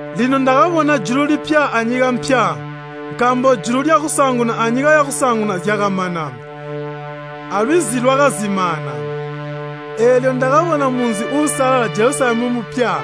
Lino ndakabona julu lipya anyika mpya. Nkaambo julu lyakusaanguna anyika yakusaanguna zyakamana, alwizi lwakazimaana. Eelyo ndakabona munzi uusalala, Jelusalemu mupya,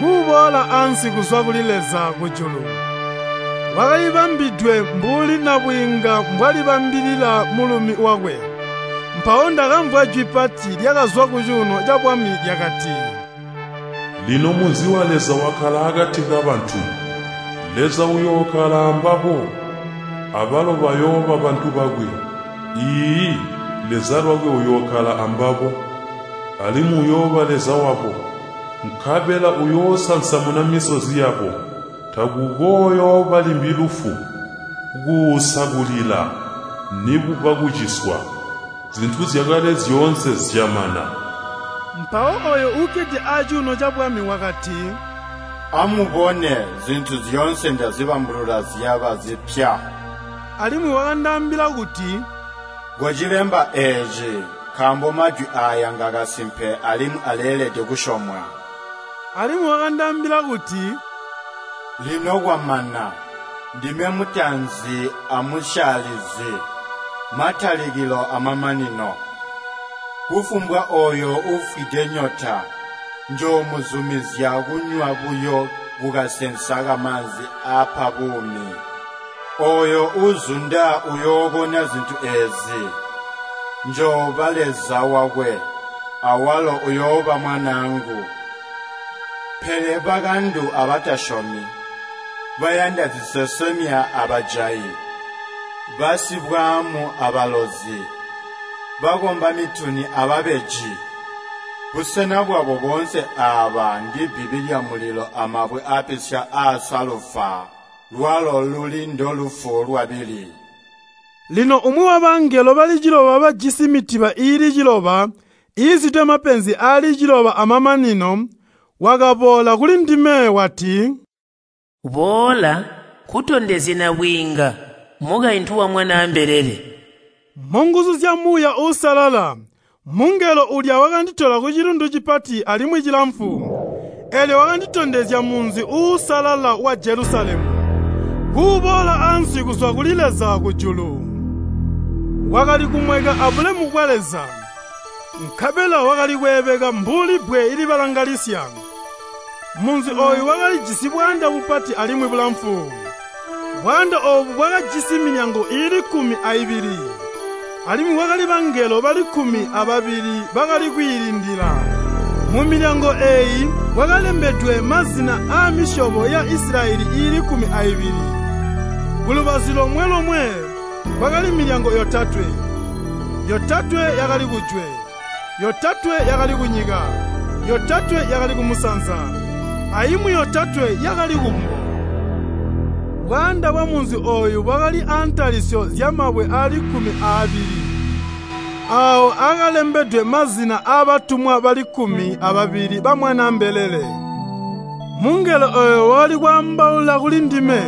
kuboola ansi kuzwa kuli Leza kujulu. Wakalibambidwe mbuli nabwiinga mbwalibambilila mulumi wakwe. Mpawo ndakamvwa jwi pati lyakazwa kucuuno cabwami lyakati, “Lino munzi wa Leza wakkala akati kabantu! Leza uyookkala ambabo, abalo bayooba bantu bakwe. Iiyi, Leza lwakwe uyookkala ambabo, alimwi uyooba Leza wabo. Nkabela uyoosansamuna misozi yabo. Takukooyooba limbi lufu, kuusa kulila, nikuba kuciswa. Zintu zyakale zyoonse zyamana.” Mpawo ooyo uukkede acuuno cabwami wakati, “Amubone, zintu zyoonse ndazibambulula zyaba zipya!” Alimwi wakandaambila kuti, “Kocilemba eeci, nkaambo majwi aaya ngakasimpe alimwi aleelede kusyomwa.” Alimwi wakandaambila kuti, “Lino kwamana! Ndime mutaanzi amusyaalizi, matalikilo amamanino. Kufumbwa ooyo uufwide nyota, njoomuzumizya kunywa buyo kukasensa kamaanzi aapa buumi. Ooyo uuzunda uyookona zintu eezi. Njooba Leza wakwe, awalo uyooba mwanaangu. Pele bakandu abatasyomi, bayanda zisesemya abajayi, basibwaamu abalozi, bakomba mituni ababeji, busena bwabo boonse aaba ndibbibi lyamulilo amabwe aapisya aasalufa, lwalo luli ndolufu lwabili.” Lino umwi wabangelo bali ciloba bajisi mitiba iili ciloba iizwide mapenzi aali ciloba aamamanino, wakaboola kulindime, wati, “Boola, nkutondezye nabwiinga, mukaintu wa Mwanaa mbelele.” Munguzu zya Muuya Uusalala, mungelo uulya wakanditola kucilundu cipati alimwi cilamfu, eelyo wakanditondezya munzi uusalala wa Jelusalemu, kuuboola ansi kuzwa kuli Leza kujulu. Wakali kumweka abulemu bwa Leza, nkabela wakali kweebeka mbuli bbwe libalangalisya. Munzi ooyu wakalijisi bwaanda bupati alimwi bulamfu. Bwaanda oobu bwakajisi milyango iili kkumi aibili, alimwi kwakali bangelo bali kkumi ababili bakali kwiilindila. Mumilyango eeyi kwakalembedwe mazina aamisyobo ya Isilayeli iili kkumi aibili. Kulubazu lomwe-lomwe kwakali milyango yotatwe, yotatwe yakali kujwe, yotatwe yakali kunyika, yotatwe yakali kumusanza, aimwi yotatwe yakali kumbo. Bwaanda bwamunzi ooyu bwakali aantalisyo zyamabwe aali kkumi aabili, aawo akalembedwe mazina aabatumwa bali kkumi ababili ba Mwanaa mbelele. Mungelo ooyo wakali kwaambaula kuli ndime,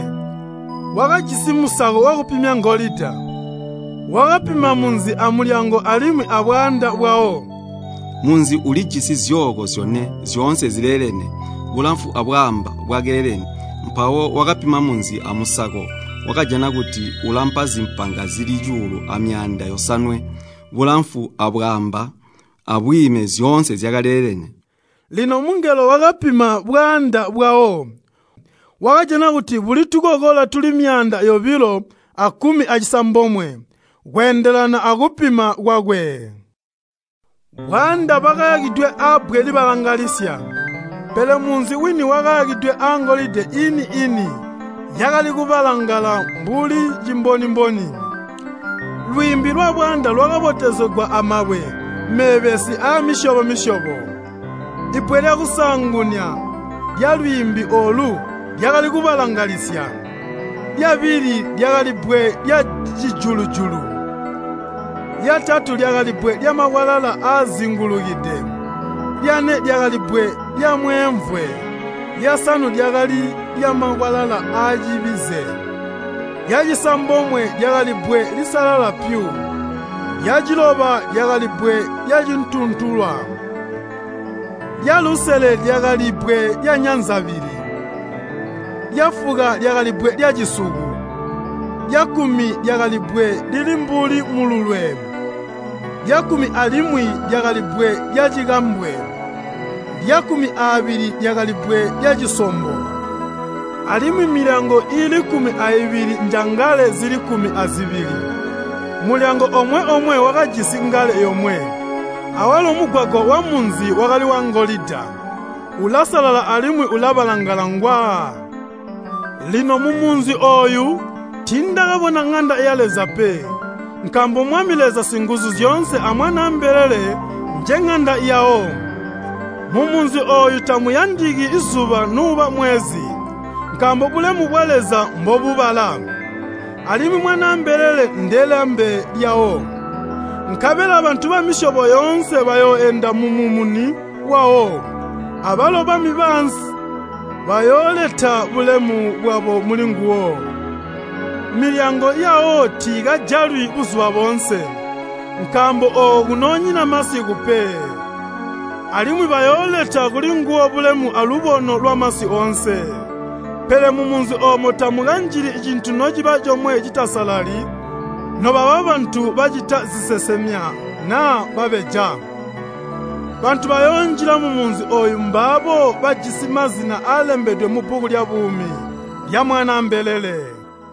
wakajisi musako wakupimya wangolida, wakapima munzi amilyango alimwi abwaanda bwawo. Munzi ulijisi zyooko zyone, zyoonse zileelene, bulamfu abwaamba bwakaleelene. Mpawo wakapima munzi amusako, wakajana kuti ulampa zimpanga zili cuulu amyaanda yosanwe, bulamfu abwaamba abwiime zyoonse zyakaleelene. Lino mungelo wakapima bwaanda bwawo, wakajana kuti buli tukokola tuli myaanda yobilo akkumi acisambomwe, kweendelana akupima kwakwe. Bwaanda bwakayakidwe abbwe libalangalisya, pele munzi wini wakayakidwe angolida iini-ini yakali kubalangala mbuli cimboni-mboni. Lwiimbi lwabwaanda lwakabotezegwa amabwe meebesi aamisyobo-misyobo. Bbwe lyakusaanguna lyalwiimbi oolu lyakali kubalangalisya, lyabili lyakali bbwe lyacijulu-julu, lyatatu lyakali bbwe lyamakwalala aazingulukide, lyane lyakali bbwe lyamweemvwe, lyasanu lyakali lyamakwalala aacibize, lyacisambomwe lyakali bbwe lisalala pyu, lyaciloba lyakali bbwe lyacituntulwa, lyalusele lyakali bbwe lyanyanzabili, lyafuka lyakali bbwe lyacisuku, lyakkumi lyakali bbwe lili mbuli mululwe, lyakkumi alimwi lyakali bbwe lyacikambwe, lyakkumi aabili lyakali bbwe lyacisombo. Alimwi milyango iili kkumi aibili njangale zili kkumi azibili. Mulyango omwe-omwe wakajisi ngale yomwe, awalo mugwagwa wamunzi wakali wangolida, ulasalala alimwi ulabalangala ngwa. Lino mumunzi ooyu tiindakabona ŋanda ya Leza pe, nkaambo Mwami Leza Singuzuzyoonse a Mwanaa mbelele njeŋanda yawo. Mumunzi ooyu tamuyandiki zuba nuuba mwezi, nkaambo bulemu bwa Leza mbobubala, alimwi Mwanaa mbelele ndelambe lyawo. Nkabela bantu bamisyobo yoonse bayooenda mumumuni wawo, abalo bami baansi bayooleta bulemu bwabo mulinguwo. Milyango yawo tiikajalwi buzuba boonse, nkaambo ooko kunoonyina masiku pe. Alimwi bayooleta kulinguwo bulemu alubono lwamasi oonse. Pele mumunzi oomo tamukanjili cintu nociba comwe citasalali nobaba bantu bacita zisesemya naa babeja. Bantu bayoonjila mumunzi ooyo mbaabo bajisi mazina aalembedwe mubbuku lyabuumi lya Mwanaa mbelele.